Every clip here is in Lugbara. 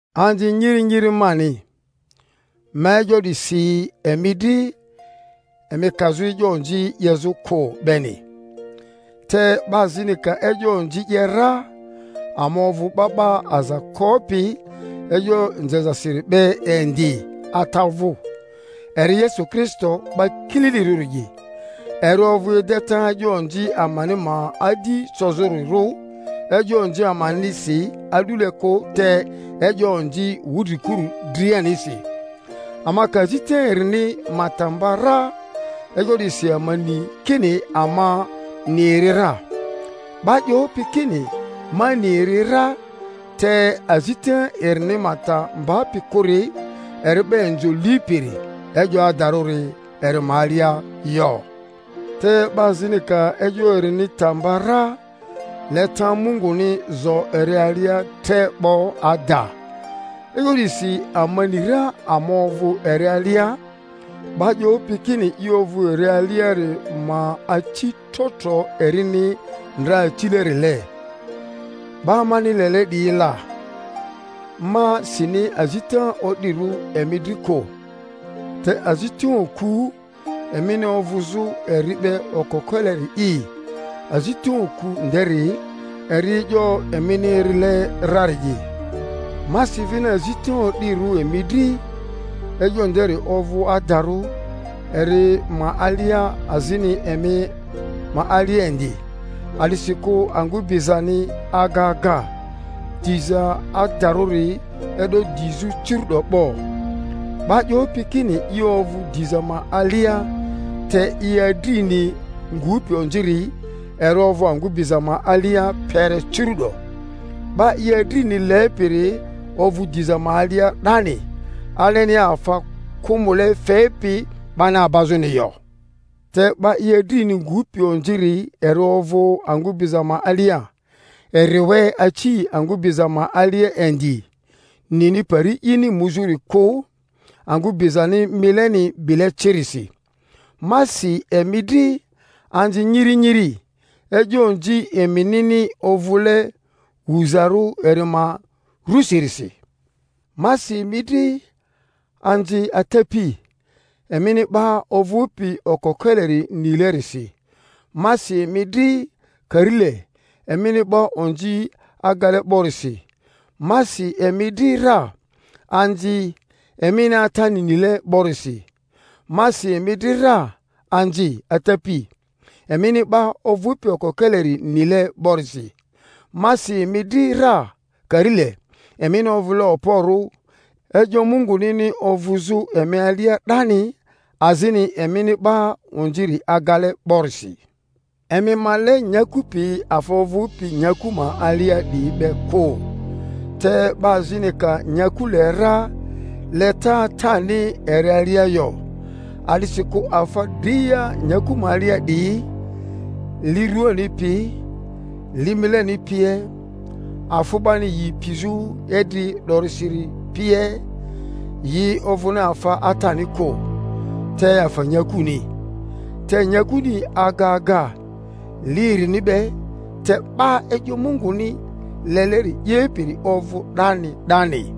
Anzi nyiri nyiri mani, ma e'yo 'diyi si emi dri emi kazᴜ e'yo onzi 'yezᴜ kᴜ beni; te 'ba azini ka e'yo onzi 'ye ra, ama ovᴜ 'Ba 'ba aza Kopi e'yo nzezasiri be indi Ata vᴜ, eri Yesu Kristo 'ba kililirᴜri'i; eri ovᴜ edeta e'yo onzi amani ma adi cozᴜrirᴜ, e'yo onzi amanisi a'dule kᴜ te e'yo onzi wudrikuru drianisi. Ama ka azita erini ma ta mba ra, e'yo 'disi ama ni kini ama ni eri ra. 'Ba 'yopi kini Ma ni eri ra, te azita erini ma ta mbapi kᴜri, eri 'ba inzo lipiri, e'yo adarᴜri eri ma alia yo; te 'ba azini ka e'yo erini ta mba ra, leta Munguni zo eri alia tre 'bo ada. E'yo 'disi ama ni ra ama ovᴜ eri alia: 'ba 'yopi kini i ovᴜ eri aliari ma aci trotro erini ndra acilerile. 'Ba mani lele 'diyi la, ma sini azita o'dirᴜ emi dri kᴜ, te azita oku emini ovᴜzᴜ eri be okokeleri'i; azita oku nderi eri e'yo emini erile rari'i. Ma si vini azita o'dirᴜ emi dri, e'yo nderi ovᴜ adarᴜ eri ma alia azini emi ma alia indi, a'disikᴜ angᴜ bizani aga aga, diza adarᴜri e'do dizᴜ curu'do 'bo. 'Ba 'yopi kini i ovᴜ diza ma alia, te i adrini ngupi onziri, eri ovᴜ angᴜ biza ma alia kpere curu'do. 'Ba i adrini lepiri ovᴜ diza ma alia 'dani, alenia afa kᴜmᴜle fepi 'bani abazᴜni yo. Te 'ba i adrini ngupi onziri eri ovᴜ angᴜ biza ma alia, eri we aci angᴜ biza ma alia indi, nini pari ini muzᴜri kᴜ, angᴜ bizani mileni bile cirisi. Ma si emi dri, anzi nyiri nyiri, e'yo onzi eminini ovᴜle wuzaru eri ma rusirisi. Ma si emi dri, anzi atapi, emini 'ba ovᴜpi okokeleri nilerisi. Ma si emi dri, karile, emini 'ba onzi agale 'borisi. Ma si emi dri ra, anzi, emini Atani nile 'borisi. Ma si emi dri ra, anzi atapi, emini 'ba ovᴜpi okokeleri nile 'borisi. Ma si emi dri ra, karile, emini ovᴜle okporᴜ, e'yo Mungunini ovᴜzᴜ emi alia 'dani, azini emini 'ba onziri agale 'borisi. Emi ma le nyaku pi afa ovᴜpi nyaku ma alia 'diyi be kᴜ. Te 'ba azini ka nyaku le ra, leta Atani eri alia yo. A'disikᴜ afa dria nyaku ma alia 'diyi, li ruani pi, li mileni pie, afᴜ 'bani yi ipizᴜ idri 'dorisiri pie, yi ovᴜni afa Atani kᴜ, te afa nyakuni. Te nyakuni aga aga, li erini be; te 'ba e'yo Munguni leleri 'yepiri ovᴜ 'dani 'dani.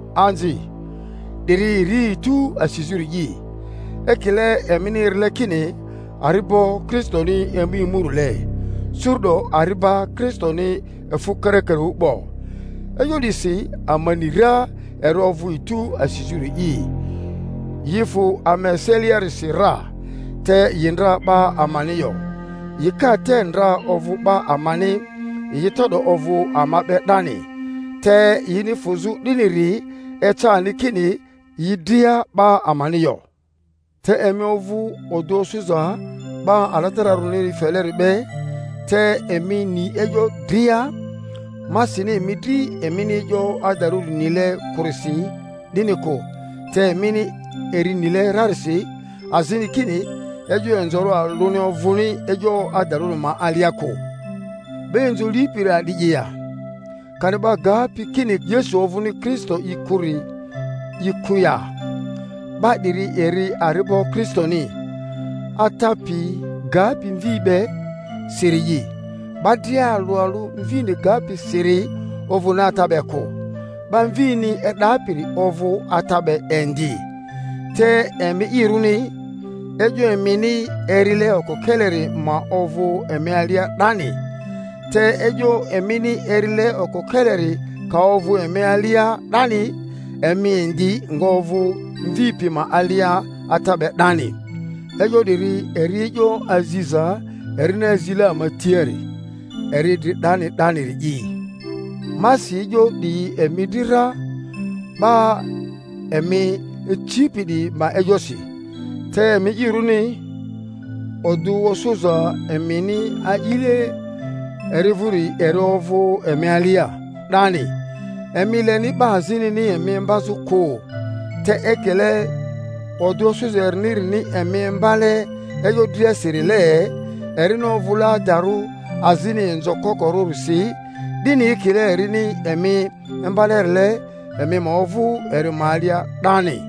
Anzi, 'diri eri etu asizᴜri'i; ekile emini erile kini ari'bo Kristoni emu emurile, curu’do ari'ba Kristoni efᴜ karakaraᴜ 'bo; e'yo 'disi ama ni ra eri ovᴜ etu asizᴜri'i. Yi fᴜ ama eseliarisi ra, te yi ndra 'ba amani yo: yi ka te ndra ovᴜ 'ba amani, yi te'do ovᴜ ama be 'dani; te yini fᴜzᴜ 'diniri ece ani kini yi dria 'ba amani yo. Te emi ovᴜ odᴜ osᴜza 'Ba Alatararᴜrini feleri be, te emi ni e'yo dria. Ma sini emi dri emini e'yo adarᴜri nile kᴜrisi, 'dini kᴜ, te emini eri nile rarisi, azini kini e'yo inzorᴜ alᴜni ovᴜni e'yo adarᴜri ma alia kᴜ. 'Ba inzo lipiri a'di'i ya, kani 'ba gapi kini Yesu ovᴜni Kristo'i kᴜri'i kᴜ ya? 'Ba 'diri eri ari'bo Kristoni, Ata pi gapi Mvi be siri’i. 'Ba dria alᴜ alᴜ Mvini gapi siri ovᴜni Ata be kᴜ. 'Ba Mvini e'dapiri ovᴜ Ata be indi. Te emi'irᴜni, e'yo emini erile okokeleri ma ovᴜ emi alia 'dani. Te e'yo emini erile okokeleri ka ovᴜ emi alia 'dani, emi indi nga ovᴜ Mvi pi ma alia Ata be 'dani. E'yo 'diri eri e'yo aziza erini azile ama tiari, eri idri 'dani 'daniri'i. Ma si e'yo 'diyi emi dri ra, 'ba emi icipi 'diyi ma e'yosi; te emi'irᴜni, odᴜ osᴜza emini a'ile erI vᴜri eri ovᴜ emi alia 'dani, emi leni 'ba azinini emi imbazᴜ kᴜ; te ekile odᴜ osᴜza erinirini emi imbale e'yo driasirile, erini ovᴜle adarᴜ azini inzo kokorᴜrisi, 'dini ekile erini emi imbalerile, emi ma ovᴜ eri ma alia 'dani.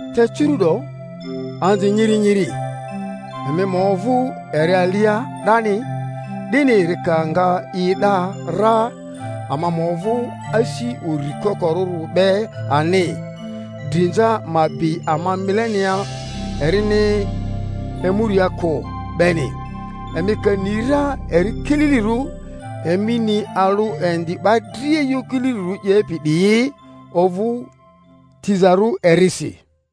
Te curu'do, anzi nyiri nyiri, emi ma ovᴜ eri alia 'dani, 'dini eri ka nga i e'da ra, ama ma ovᴜ asi uri kokorᴜri be ani, drinza ma bi ama milenia erini emuria kᴜ beni. Emi ka ni ra eri kililirᴜ, emi ni alᴜ indi 'ba dria e'yo kililirᴜ 'yepi 'diyi ovᴜ tizarᴜ erisi.